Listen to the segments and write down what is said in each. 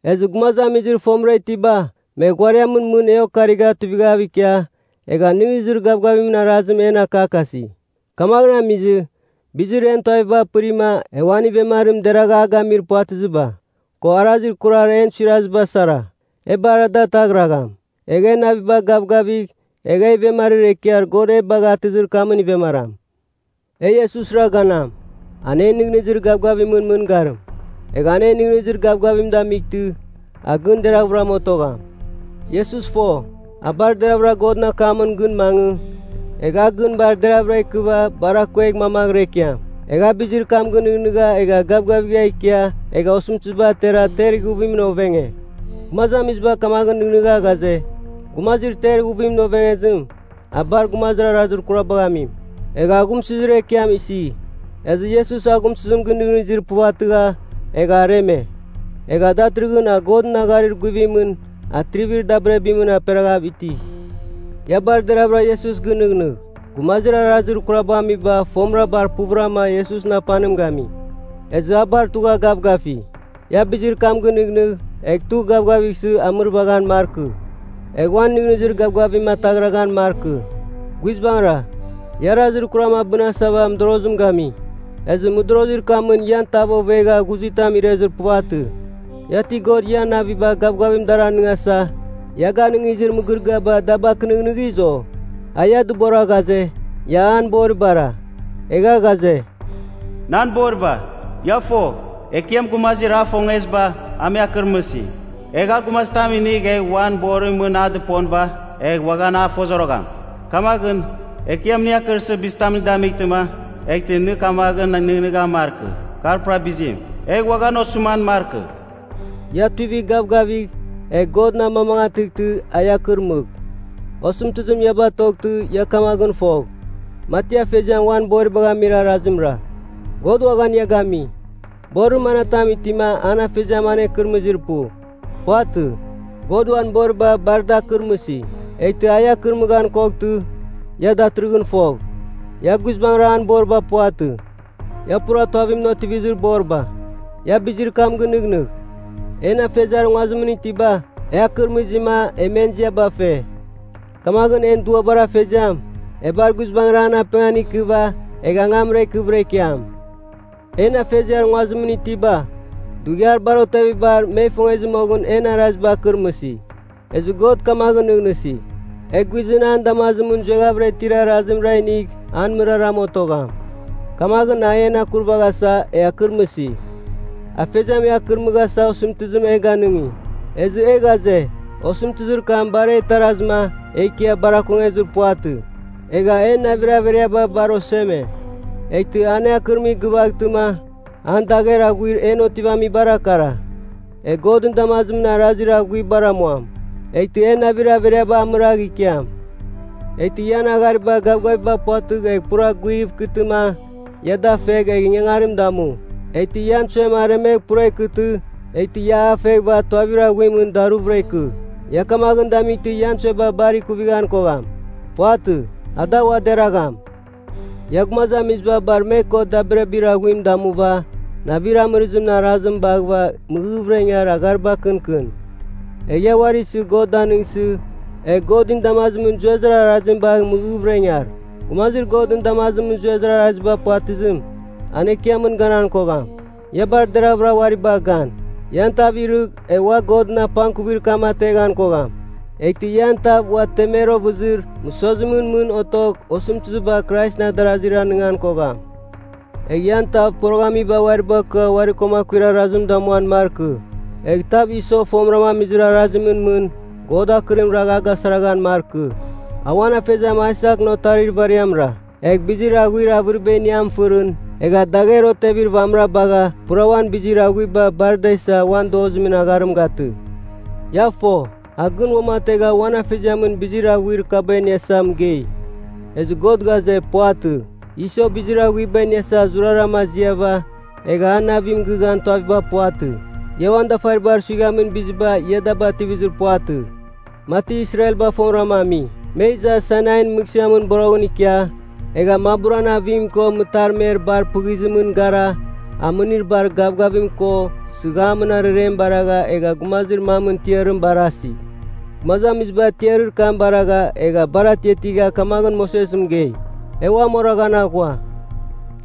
Ezɨ gumazamizir fomɨra itiba, me ghuariamɨn mɨn e okarigha tuivaghav ikia, egha nɨghnɨzir gavgavimɨn arazim en akakasi. Kamaghɨn amizɨ, bizir en tuaviba pɨrima e uan ivemarim deragha a gamir puvatɨziba, ko arazir kurar en suiraziba sara, e bar ada ataghragham. Egh e naviba gavgavigh egh e ivemarir ekiar God e bagha atɨzir kamɨn ivemaram. E Iesusra ganam, an en nɨghnɨzir gavgavimɨn mɨngarim, egh an en nɨghnɨzir gavgavim damightɨ, a gɨn deraghvɨram otogham. Iesus fo, a bar deravɨra Godɨn akamɨn gɨn mangɨ egh a gɨn bar deravɨra ikɨva bar akuegh mamaghɨra ikiam. Egha a bizir kam gɨnɨghnɨgha egha gavgavigha ikia egha osɨmtɨziba atera ter ighuvimɨn ovenge. Gumazamiziba kamaghɨn nɨghnɨgha ghaze, gumazir ter ighuvimɨn ovengezim, a bar gumazir arazir kurabagh amim, egha aghumsɨzir ekiam isi. Ezɨ Iesus aghumsɨzim gɨnɨghnɨzir puvatɨgha, egha areme. Egha datɨrɨghɨn a Godɨn agharir guvimɨn atrivir dabirabimɨn aperaghav iti. Ia bar deraghvɨra Iesus gɨnɨghnɨgh. Gumazir arazir kurabagh amiba fomɨra bar puvɨrama Iesusɨn apanim gami. Ezɨ a bar tugha gavgafi. Ia bizir kam gɨnɨghnɨgh egh tugh gavgavighsɨ amɨrvaghan markɨ, egh uan nɨghnɨzir gavgavim ataghraghan markɨ. Guizbangɨra, ia arazir kuram abɨnasava mɨdorozim gami, ezɨ mɨdorozir kamɨn ian tav ovegha ghuzitam irezir puvatɨ. Ia ti God ian naviba gavgavim dar anɨngasa ia ganɨngizir mɨgɨrɨgɨaba da bakɨnɨghnɨghiz, o? A ia dɨbora ghaze, ia an boribara, egha ghaze, “Nan boriba, ia fo, Ekiam gumazir a ifongeziba a me akɨrmɨsi. Egh a gumazitam inigh egh uan borimɨn mɨn a dɨponɨva, egh uaghan a fozorogham. Kamaghɨn, Ekiam nɨ akɨrsɨ bizitam nɨ damightɨma, eghtɨ nɨ kamaghɨn nɨghnɨghan markɨ, kar pura bizim. Egh uaghan osɨman markɨ.” Ia tuivigh gavgavigh, egh Godɨn amamangatɨghtɨ a ia akɨrmɨgh. Osɨmtɨzim ia batoghtɨ ia kamaghɨn fogh, mati afeziam uan boribagh amir arazimra, God uaghan ia gami. Borir manatam itima an afeziam anekɨrɨmɨzir pu? Puvatɨ. God uan boriba bar da akɨrmɨsi. Eghtɨ a ia akɨrmɨghan koghtɨ, ia datɨrɨghɨn fogh, ia guizbangrama an boriba puvatɨ. Ia pura tuavimɨn otivizir boriba. Ia bizir kam gɨnɨghnɨgh, en afeziar nguazimɨn itiba, e akɨrmɨzima e men ziaba fe. Kamaghɨn en duabar Afeziam, e bar guizbangɨra an apengan ikɨva egh angamra ikɨvɨra ikiam. En afeziar nguazimɨn itiba, dughiar bar otevibar me ifongezɨ moghɨn en araziba akɨrmɨsi. Ezɨ God kamaghɨn nɨghnɨsi, e guizɨn an damazimɨn zueghavɨra itir arazimra inigh an mɨraram otogham. Kamaghɨn a en akurvaghasa, e akɨrmɨsi. Afeziam e akɨrmɨghasa osɨmtɨzim e ganɨngi, ezɨ e ghaze, osɨmtɨzir kam bar e itarazɨma e ikia bar akongezir puvatɨ. Egha en navir averiaba bar oseme. Eghtɨ an e akɨrmɨgh gɨvaghtɨma, an dagher aghuir en otivamibara kara: e Godɨn damazimɨn arazir aghuibara amuam, eghtɨ en navir averiaba amiragh ikiam. Eghtɨ ian aghariba gavgaviba puvatɨgh egh pura guighɨv ikɨtɨma, ia da feghɨva egh ingangarim damu. Eghtɨ ian suem aremegh pura ikɨtɨ, eghtɨ ia a feghɨva tuavir aghuimɨn daruvɨra ikɨ. Ia kamaghɨn damightɨ ian sueba bar ikuvighan kogham. Puvatɨ. Ada ua deragham. Ia, gumazamiziba bar me ko, dabirabir aghuim damuva, navir amɨrɨzimɨn arazim baghɨva mɨghɨghvɨra ingar aghariba kɨnkɨn. Egh ia uari isɨ God danɨngsɨ, egh Godɨn damazimɨn zuezir arazim bagh mɨghɨghvɨra ingar. Gumazir Godɨn damazimɨn zuezir araziba puvatɨzim, an Ekiamɨn ganan kogham. Ia bar deraghvɨra uari bagh gan, ian tav irɨgh egh ua Godɨn apangkuvir kam ateghan kogham. Eghtɨ ian tav ua temer ovɨzir mɨsozimɨn mɨn otogh osɨmtɨziba Kraisɨn adarazir anɨngan kogham. Egh ian tav poroghamiba uari bakɨa uari ko akuir arazim damuan markɨ. Egh tav Iso fomɨra amizir arazimɨn mɨn, God akɨrim ragh a gasaraghan markɨ. A uan afeziam Aisakɨn otarir ivariamra, egh bizir aghuir avɨriba iniam fɨrɨn, egha dagher otevir vamɨra bagha pura uan bizir aghuiba bar da isa uan dozimɨn agharim gatɨ. Ia fo, a gɨn uamategha uan afeziamɨn bizir aghuir kaba iniasa mɨgei. Ezɨ God ghaze, puvatɨ. Iso bizir aghuiba iniasa zurarama aziava, egha a navim gɨghan tuaviba puvatɨ. Ia uan dafaribar suighamin biziba ia da bativizir puvatɨ, mati Israelba fomɨrama ami. Me iza Sainain Mɨghsɨamɨn boroghɨn ikia, egha maburan avim ko mɨtarmer bar pɨzimɨn gara amɨnir bar gavgavim ko sɨghamɨn ararem baragha egha gumazir mamɨn tiarim barasi. Gumazamiziba tiarir kam baragha egha bar atiatigha kamaghɨn Moses mɨgei, “E uam oraghan aghua.”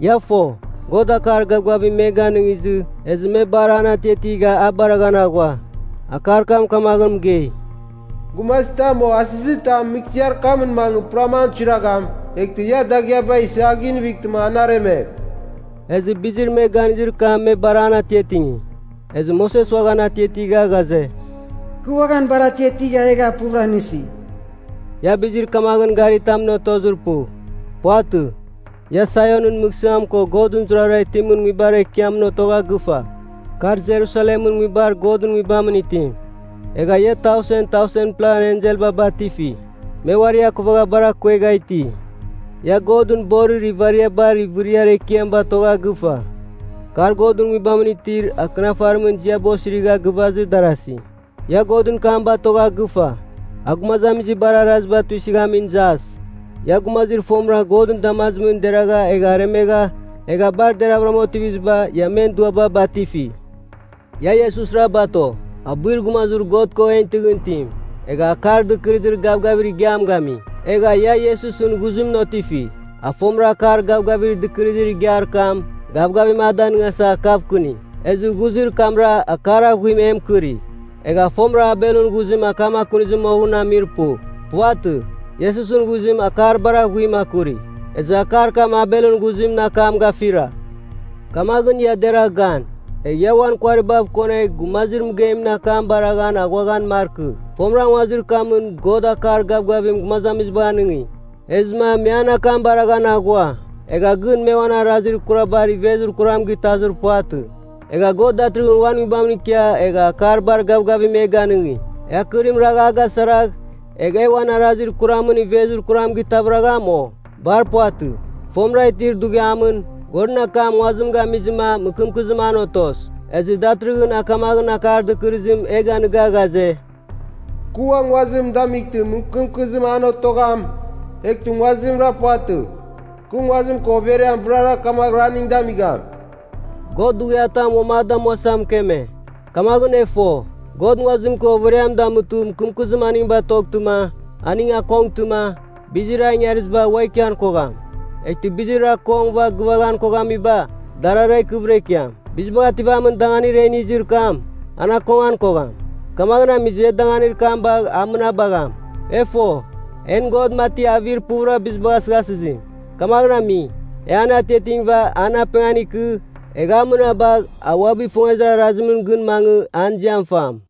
Ia fo, God akar gavgavim me ganɨngizɨ ezɨ me bar an atiatigha baraghan aghua. Akar kam kamaghɨn mɨgei, “Gumazitam o asɨzitam mɨghsɨar kamɨn mangɨ puram an suiragham, eghtɨ ia dagɨaba isɨ a ginivightɨma an aremegh.” Ezɨ bizir me ganizir kam me bar an atiatingi, ezɨ Moses uaghan atiatigha ghaze, “Kɨ uaghan bar atiatigha egha puvɨra nɨsi.” Ia bizir kamaghɨn garitamɨn otozir pu. Puvatɨ. Ia Saionɨn Mɨghsɨam ko Godɨn zurara itimɨn nguibar ekiamɨn otogha gɨfa, kar Jerusalemɨn nguibar Godɨn Nguibamɨn itim. Egha ia tausen tausenpla enselba batifi, me uari akuvagha bar akuegha iti. Ia Godɨn borir ivariabar ivɨriar ekiam batogha gɨfa, kar Godɨn Nguibamɨn itir Akɨnafarimɨn ziaba osirigha gɨvazɨ darasi. Ia Godɨn kam batogha gɨfa, a gumazamiziba bar araziba tuisɨghamin Jas. Ia, gumazir fomɨra Godɨn damazimɨn deragha egha aremegha, egha bar deravɨram otiviziba, ia men duaba batifi. Ia Iesusra bato, abuir gumazir God ko en tɨghɨn itim, egha Akar Dɨkɨrɨzir Gavgavir Igiam gami. Egha ia Iesusɨn ghuzimɨn otifi, a fomɨra akar gavgavir dɨkɨrɨzir igiar kam gavgavim a danɨngasa akavkɨni. Ezɨ ghuzir kamra akar aghuim e mɨkɨri, egha fomɨra Abelɨn ghuzim akam akunizɨ moghɨn amir pu. Puvatɨ. Iesusɨn ghuzim akar bar aghuim akuri, ezɨ akar kam Abelɨn ghuzimɨn akam gafira. Kamaghɨn, ia deragh gan, egh ia uan kuaribav konegh Gumazir Mɨgeimɨn akam baraghan aghuaghan markɨ. Fomɨra nguazir kamɨn God akar gavgavim gumazamizibagh anɨngi. Ezɨma me an akam baraghan aghua, egha gɨn me uan arazir kurabar ivezir kuram gitazir puvatɨ. Egha God datɨrɨghɨn uan Nguibamɨn ikia egha akar bar gavgavim e ganɨngi. E akɨrim ragh a gasaragh egh e uan arazir kuramɨn ivezir kuram gitavɨragham, o? Bar puvatɨ. Fomɨra itir dughiamɨn, Godɨn akam nguazim gamizɨma mɨkɨmkɨzim an otos. Ezɨ datɨrɨghɨn a kamaghɨn akar dɨkɨrɨzim e ganigha ghaze, “Kɨ ua nguazim damightɨ mɨkɨmkɨzim an otogham, eghtɨ nguazimra puvatɨ, kɨ nguazim ko overiam vɨrara kamaghɨra aning damigham.” God dughiatam uam a damuasa mɨkeme, kamaghɨn e fo, God nguazim ko overiam damutɨ mɨkɨmkɨzim aning batoghtɨma aning akongtɨma, bizir a ingariziba ua ikian kogham. Eghtɨ bizir akongɨva gɨvaghan koghamiba, darara ikɨvɨra ikiam. Bizibagh Ativamin Danganir e inizir kam, an akongan kogham. Kamagh amizɨ e danganir kam bagh an mɨnabagham. E fo, en God mati avir puvɨra bizibagh asɨghasɨzim. Kamaghɨn ami, e an atiatingɨva an apengan ikɨ, egh an mɨnabagh a uabɨ ifongezir arazimɨn gɨn mangɨ an ziam fam.